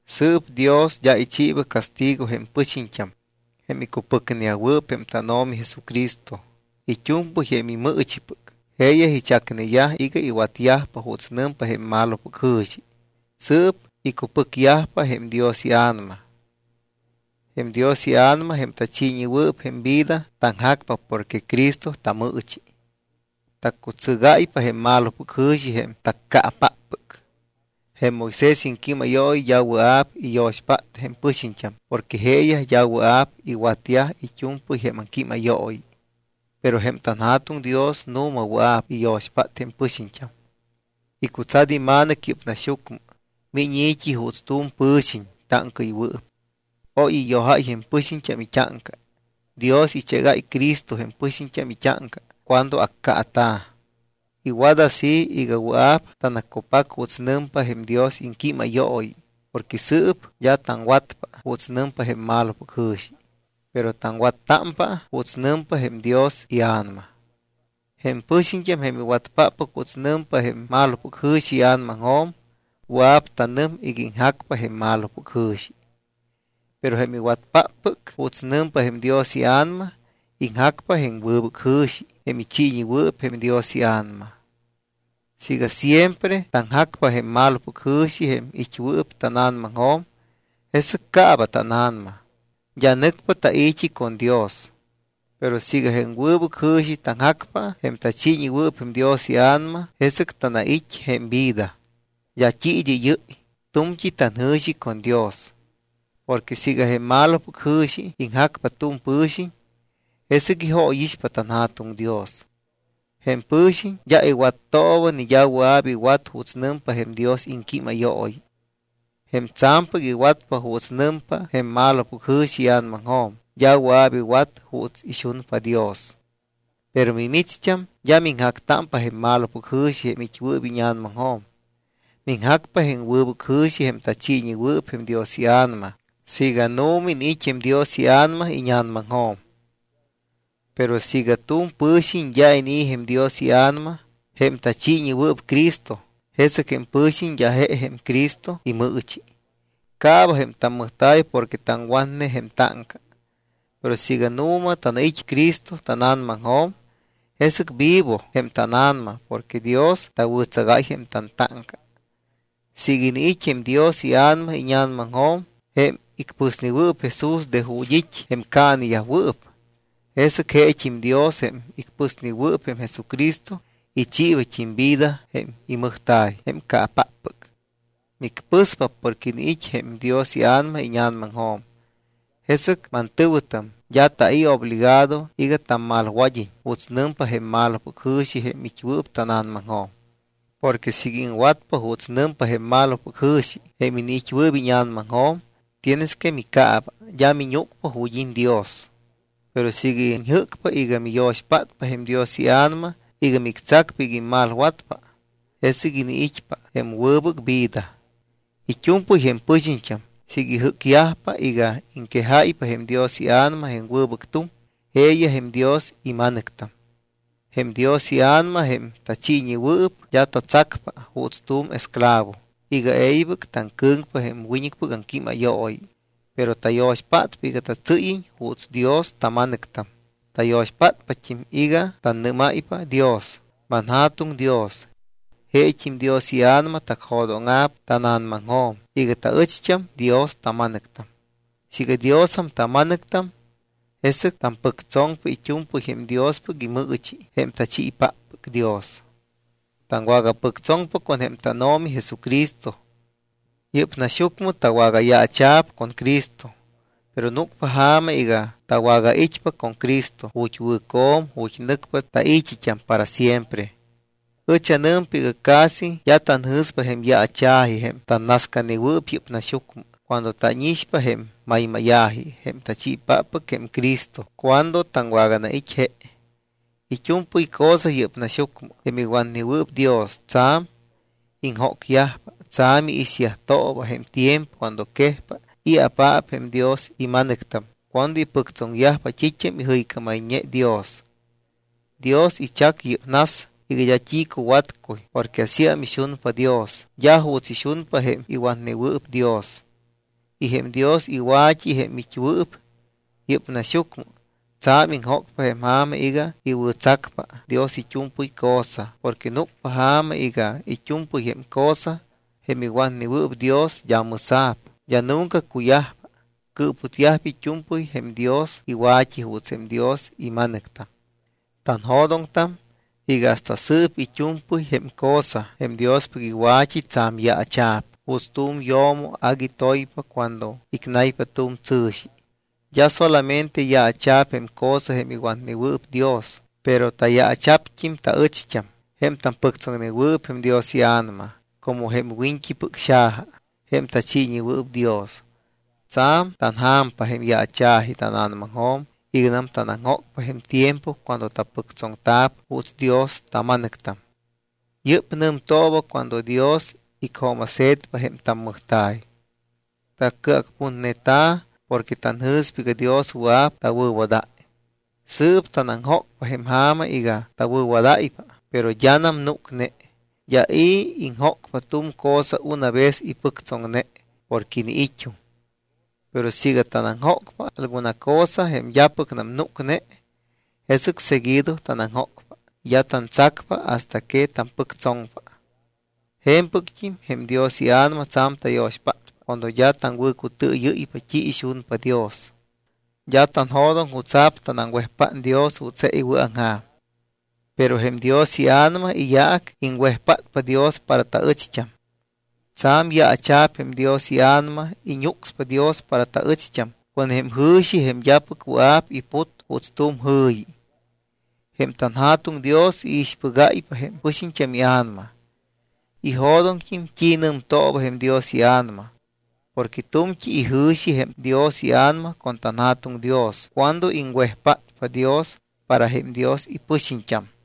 Sɨɨp Dios d́a ichiiba castigo jém pɨxiñt́am, jém icupɨcneyajwɨɨp jém tánO̱mi Jesucristo, it́u̱mpɨy jém imɨɨchipɨc. Jeeyaj ichacneyaj iga iwatyajpa juuts nɨmpa jém malopɨc jɨ̱xi. Sɨɨp icupɨcyajpa jém Dios iA̱nama. Jém Dios iA̱nama jém tachiiñewɨɨp jém vida, taŋjacpa porque Cristo tamɨɨchi. Taccutsɨgáypa jém malopɨc jɨ̱xi jém taccaapáppɨc. Jém Moisés iŋquímayooyi d́a wɨa̱p iyo̱xpát jém pɨxiñt́am porque jeeyaj d́a wɨa̱p iwatyaj it́u̱mpɨy jém aŋquímayooyi. Pero jém tanJa̱tuŋ Dios nu̱ma wɨa̱p iyo̱xpát jém pɨxiñt́am. Icutsat iMa̱nɨc yɨ́p naxyucmɨ. Miñ i̱t́i juuts tu̱m pɨ̱xiñ táŋcaɨywɨɨp. Oy iyojáy jém pɨxiñt́am it́áŋca. Dios ichégáy Cristo jém pɨxiñt́am it́áŋca cuando accaata̱. Iwat así iga wɨa̱p tanaccupac juuts nɨmpa jém Dios iŋquímayooyi porque sɨɨp d́a taŋwatpa juuts nɨmpa jém malopɨc jɨ̱xi, pero taŋwattámpa juuts nɨmpa jém Dios iA̱nama. Jém pɨxiñt́am, jém iwatpáppɨc juuts nɨmpa jém malopɨc jɨ̱xi ia̱namaŋjo̱m, wɨa̱p tanɨm iga iŋjacpa jém malopɨc jɨ̱xi. Pero jém iwatpáppɨc juuts nɨmpa jém Dios iA̱nama, iŋjacpa jém wɨbɨc jɨ̱xi jém ichiiñewɨɨp jém Dios iA̱nama. Siiga siempre taŋjacpa jém malopɨc jɨ̱xi jém it́wɨɨp tána̱namaŋjo̱m, jesɨc caaba tána̱nama. D́a nɨcpa tai̱t́i con Dios. Pero siiga jém wɨbɨc jɨ̱xi taŋjacpa, jém tachiiñewɨɨp jém Dios iA̱nama, jesɨc tanait́ jém vida. D́a t́i id́ɨ́yɨ́y, tu̱mt́i tanjɨ̱xi con Dios. Porque siiga jém malopɨc jɨ̱xi iŋjacpa tu̱m pɨ̱xiñ, jesɨc ijóyixpa tanJa̱tuŋ Dios. Jém pɨ̱xiñ d́a iwattooba, ni d́a wɨa̱p iwat juuts nɨmpa jém Dios iŋquímayooyi. Jém tsa̱mpɨc iwatpa juuts nɨmpa jém malopɨc jɨ̱xi ia̱namaŋjo̱m, d́a wɨa̱p iwat juuts ixunpa Dios. Pero mimicht́am d́a miŋjactámpa jém malopɨc jɨ̱xi jém it́wɨɨp íña̱namaŋjo̱m. Miŋjacpa jém wɨbɨc jɨ̱xi jém tachiiñewɨɨp jém Dios iA̱nama siiga nu̱ma iniit́ jém Dios iA̱nama íña̱namaŋjo̱m. Pero siiga tu̱m pɨ̱xiñ d́a inii̱ jém Dios iA̱nama, jém tachiiñewɨɨp Cristo, jesɨc jém pɨ̱xiñ d́a je jém Cristo imɨɨchi. Caaba jém tammɨjta̱y porque taŋwatne jém táŋca. Pero siiga nu̱ma tanait́ Cristo tána̱namaŋjo̱m, jesɨc vivo jém tána̱nama porque Dios tawɨ̱tsagáy jém tantáŋca. Siiga iniit́ jém Dios iA̱nama íña̱namaŋjo̱m, jém icpɨsnewɨɨp Jesús de ju̱t́ it́ jém caaneyajwɨɨp, jesɨc jeet́im Dios, jém icpɨsnewɨɨp jém Jesucristo, ichiibat́im vida jém immɨjta̱y jém caapáppɨc. Micpɨspa porque iniit́ jém Dios iA̱nama íña̱namaŋjo̱m. Jesɨc, mantɨ̱wɨtam, d́a tai̱ obligado iga tammalwad́iñ juuts nɨmpa jém malopɨc jɨ̱xi jém it́wɨɨp tána̱namaŋjo̱m. Porque siiga iŋwatpa juuts nɨmpa jém malopɨc jɨ̱xi, jém iniit́wɨɨp íña̱namaŋjo̱m, tienes que micaaba, d́a miñúcpa ju̱t́ it́ Dios. Pero siiga iñjɨ́cpa iga miyo̱xpátpa jém Dios iA̱nama iga mictsacpa iga immalwatpa, jesɨc iniit́pa jém wɨbɨc vida. It́u̱mpɨy jém pɨxiñt́am siiga ijɨ́cyajpa iga iŋquejáypa jém Dios iA̱nama jém wɨbɨc tuŋ, jeeyaj jém Dios ima̱nɨctam. Jém Dios iA̱nama, jém tachiiñewɨɨp, d́a tatsacpa juuts tu̱m esclavo iga e̱ybɨc taŋcɨ̱ŋpa jém wiñɨcpɨc aŋquímayooyi. Pero tayo̱xpátpa iga tatsɨ́yiñ juuts Dios tama̱nɨctam. Tayo̱xpátpat́im iga tannɨ́máypa Dios: “ManJa̱tuŋ Dios.” Jeet́im Dios iA̱nama tacjo̱dóŋa̱p tána̱namaŋjo̱m iga taɨcht́am Dios tama̱nɨctam. Siiga Diosam tama̱nɨctam, jesɨc tampɨctsoŋpa it́u̱mpɨy jém Diospɨc imɨɨchi jém tachiipáppɨc Dios. Taŋwagapɨctsoŋpa con jém tánO̱mi Jesucristo. Yɨ́p naxyucmɨ tawagayaacha̱p con Cristo, pero núcpa ja̱ma iga tawagait́pa con Cristo ju̱t́ wɨ̱co̱m, ju̱t́ nɨcpa tai̱t́it́am para siempre. Ɨch anɨmpa iga casi d́a tanjɨ̱spa jém yaacha̱ji, jém tannascanewɨɨp yɨ́p naxyucmɨ, cuando tánixpa jém maymáya̱ji jém tachiipáppɨc jém Cristo cuando taŋwaganait́ je. It́u̱mpɨy cosa yɨ́p naxyucmɨ, jém iwatnewɨɨp Dios, tsa̱m iŋjócyajpa, tsa̱m iixyajtooba jém tiempo cuando quejpa i̱apaap jém Dios ima̱nɨctam, cuando ipɨctsoŋyajpa t́it́am ijɨycámayñe Dios. Dios ichac yɨ́p nas iga d́a t́i cuwatcuy porque asíam ixunpa Dios, d́a juuts ixunpa jém iwatnewɨɨp Dios. Y jém Dios iwa̱t́i, jém it́wɨɨp yɨ́p naxyucmɨ, tsa̱m iŋjócpa jém ja̱ma iga iwɨ̱tsacpa Dios it́u̱mpɨy cosa. Porque núcpa ja̱ma iga it́u̱mpɨy jém cosa, jém iwatnewɨɨp Dios, d́a mɨsa̱p, d́a nunca cuyajpa. Cɨɨputyajpa it́u̱mpɨy jém Dios iwa̱t́i juuts jém Dios ima̱nɨctam. Tanjo̱doŋtam iga hasta sɨɨp it́u̱mpɨy jém cosa, jém Diospɨc iwa̱t́i, tsa̱m yaacha̱p juuts tu̱m yo̱mo agui toypa cuando icnaypa tu̱m tsɨ̱xi. D́a solamente yaacha̱p jém cosa, jém iwatnewɨɨp Dios, pero tayaacha̱pt́im taɨcht́am, jém tampɨctsoŋnewɨɨp jém Dios iA̱nama como jém wiñt́ipɨc xaja, jém tachiiñewɨɨp Dios. Tsa̱m tanja̱mpa jém yaacha̱ji tána̱namaŋjo̱m iganam tanaŋjócpa jém tiempo cuando tapɨctsoŋta̱p juuts Dios tama̱nɨctam. Yɨ́p nɨmtooba cuando Dios icjooma̱se̱tpa jém tammɨjta̱y. Tacɨacputneta̱ porque tanjɨ̱spa iga Dios wɨa̱p tawɨ̱wadáy. Sɨɨp tanaŋjócpa jém ja̱ma iga tawɨ̱wadáypa, pero d́anam núcne. D́a i̱ iŋjócpa tu̱m cosa una vez ipɨctsoŋne porque iniit́um. Pero siiga tanaŋjócpa alguna cosa jém d́apɨcnam núcne, jesɨc seguido tanaŋjócpa y d́a tantsacpa hasta que tampɨctsoŋpa. Je̱mpɨct́im jém Dios iA̱nama tsa̱m tayo̱xpátpa cuando d́a taŋwɨ̱cutɨɨyɨ́ypa t́i ixunpa Dios. D́a tanjo̱doŋ jutsa̱p tanaŋwejpát Dios juuts je iwɨ̱aŋja̱m. Pero jém Dios iA̱nama iyaac iŋwejpátpa Dios para taɨcht́am. Tsa̱m yaacha̱p jém Dios iA̱nama, iñúcspa Dios para taɨcht́am con jém jɨ̱xi, jém d́apɨc wɨa̱p iput juuts tu̱m jɨ̱yi. Jém tanJa̱tuŋ Dios iixpɨgáypa jém pɨxiñt́am ia̱nama. Ijo̱doŋt́im t́i nɨmtooba jém Dios iA̱nama. Porque tu̱mt́i ijɨ̱xi jém Dios iA̱nama con tanJa̱tuŋ Dios cuando iŋwejpátpa Dios para jém Dios ipɨxiñt́am.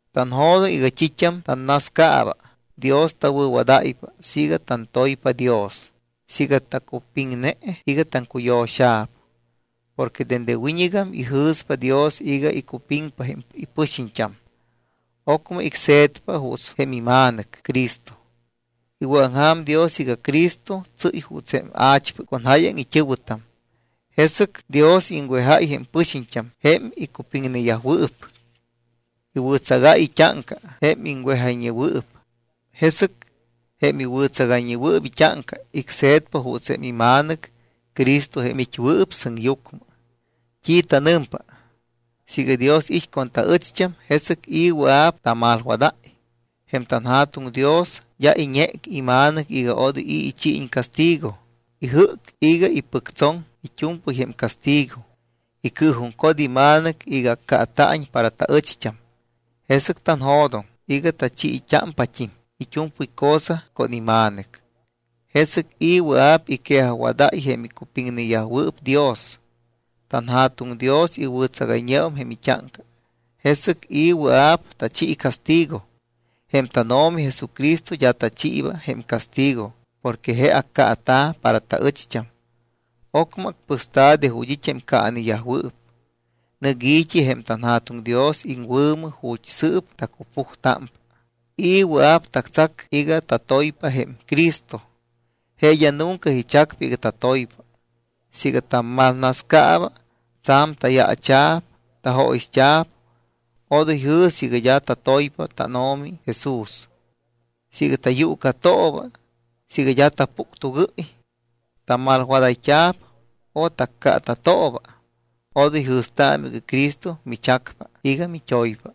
Tanjo̱doŋ iga t́it́am tannascaaba, Dios tawɨ̱wadáypa siiga tantoypa Dios, siiga tacupiŋne iga taŋcuyo̱xa̱p. Porque dende wiñɨgam ijɨ̱spa Dios iga icupiŋpa jém ipɨxiñt́am, ocmɨ icse̱tpa juuts jém iMa̱nɨc Cristo. Iwɨ̱aŋja̱m Dios iga Cristo tsɨ́y juuts jém a̱chpɨc con jáyaŋ it́ɨ̱wɨtam. Jesɨc Dios iŋwejáy jém pɨxiñt́am jém icupiŋneyajwɨɨp. Iwɨ̱tsagáy it́áŋca jém iŋwejayñeyajwɨɨp. Jesɨc jém iwɨ̱tsagayñewɨɨp it́áŋca, icse̱tpa juuts jém iMa̱nɨc Cristo, jém it́wɨɨp sɨŋyucmɨ. ¿T́i tanɨmpa? Siiga Dios it́ con taɨcht́am, ¿jesɨc i̱ wɨa̱p tamalwadáy? Jém tanJa̱tuŋ Dios d́a iñéc iMa̱nɨc iga odoy i̱ ichiiñ castigo. Ijɨ́c iga ipɨctsoŋ it́u̱mpɨy jém castigo. Icɨɨjuŋcot iMa̱nɨc iga accaata̱iñ para taɨcht́am. Jesɨc tanjo̱doŋ iga tachiit́ámpat́im it́u̱mpɨy cosa con iMa̱nɨc. ¿Jesɨc i̱ wɨa̱p iquejajwadáy jém icupiŋneyajwɨɨp Dios? TanJa̱tuŋ Dios iwɨ̱tsagayñeum jém it́áŋca. ¿Jesɨc i̱ wɨa̱p tachi castigo? Jém tánO̱mi Jesucristo d́a tachiiba jém castigo porque je accaata̱ para taɨcht́am. Ocmɨ acpɨsta̱ de ju̱t́ it́ jém caaneyajwɨɨp, nɨc i̱t́i jém tanJa̱tuŋ Dios iŋwɨ̱mɨ ju̱t́ sɨɨp tacupujtámpa. ¿I̱ wɨa̱p tactsac iga tatoypa jém Cristo? Je d́a nunca ichacpa iga tatoypa. Siiga tammalnascaaba, tsa̱m tayaacha̱p, tajóyixt́a̱p, odoy jɨ̱sɨ iga d́a tatoypa tánO̱mi Jesús. Siiga tayuucatooba, siiga d́a tapuctugɨ́y, tamalwadayt́a̱p o taccaata̱tooba; odoy jɨ̱staamɨ iga Cristo michacpa iga mit́oypa.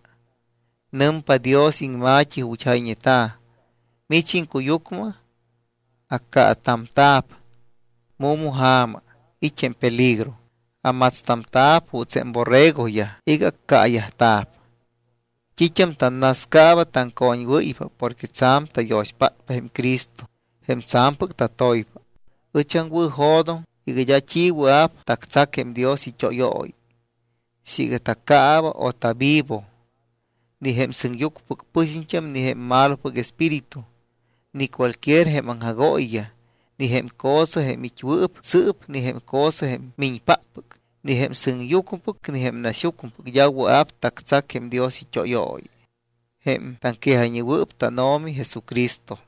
Nɨmpa Dios iŋma̱t́i ju̱t́ jayñeta̱: Mich iŋcuyucmɨ accaatamta̱p. Mu̱ma ja̱ma it́ jém peligro. Amatstamta̱p juuts jém borregoyaj iga accaayajta̱p. T́it́am tannascaaba taŋcoñwɨ́ypa porque tsa̱m tayo̱xpátpa jém Cristo jém tsa̱mpɨc tatoypa. Ɨch aŋwɨ̱jo̱doŋ iga d́a t́i wɨa̱p tactsac jém Dios it́óyooyi. Siiga tacaaba o tavivo, ni jém sɨŋyucmɨpɨc pɨxiñt́am, ni jém malopɨc espíritu, ni cualquier jém aŋjagooyiyaj, ni jém cosa jém it́wɨɨp sɨɨp, ni jém cosa jém miñpáppɨc, ni jém sɨŋyucmɨpɨc ni jém naxyucmɨpɨc d́a wɨa̱p tactsac jém Dios it́óyooyi jém taŋquejayñewɨɨp tánO̱mi Jesucristo.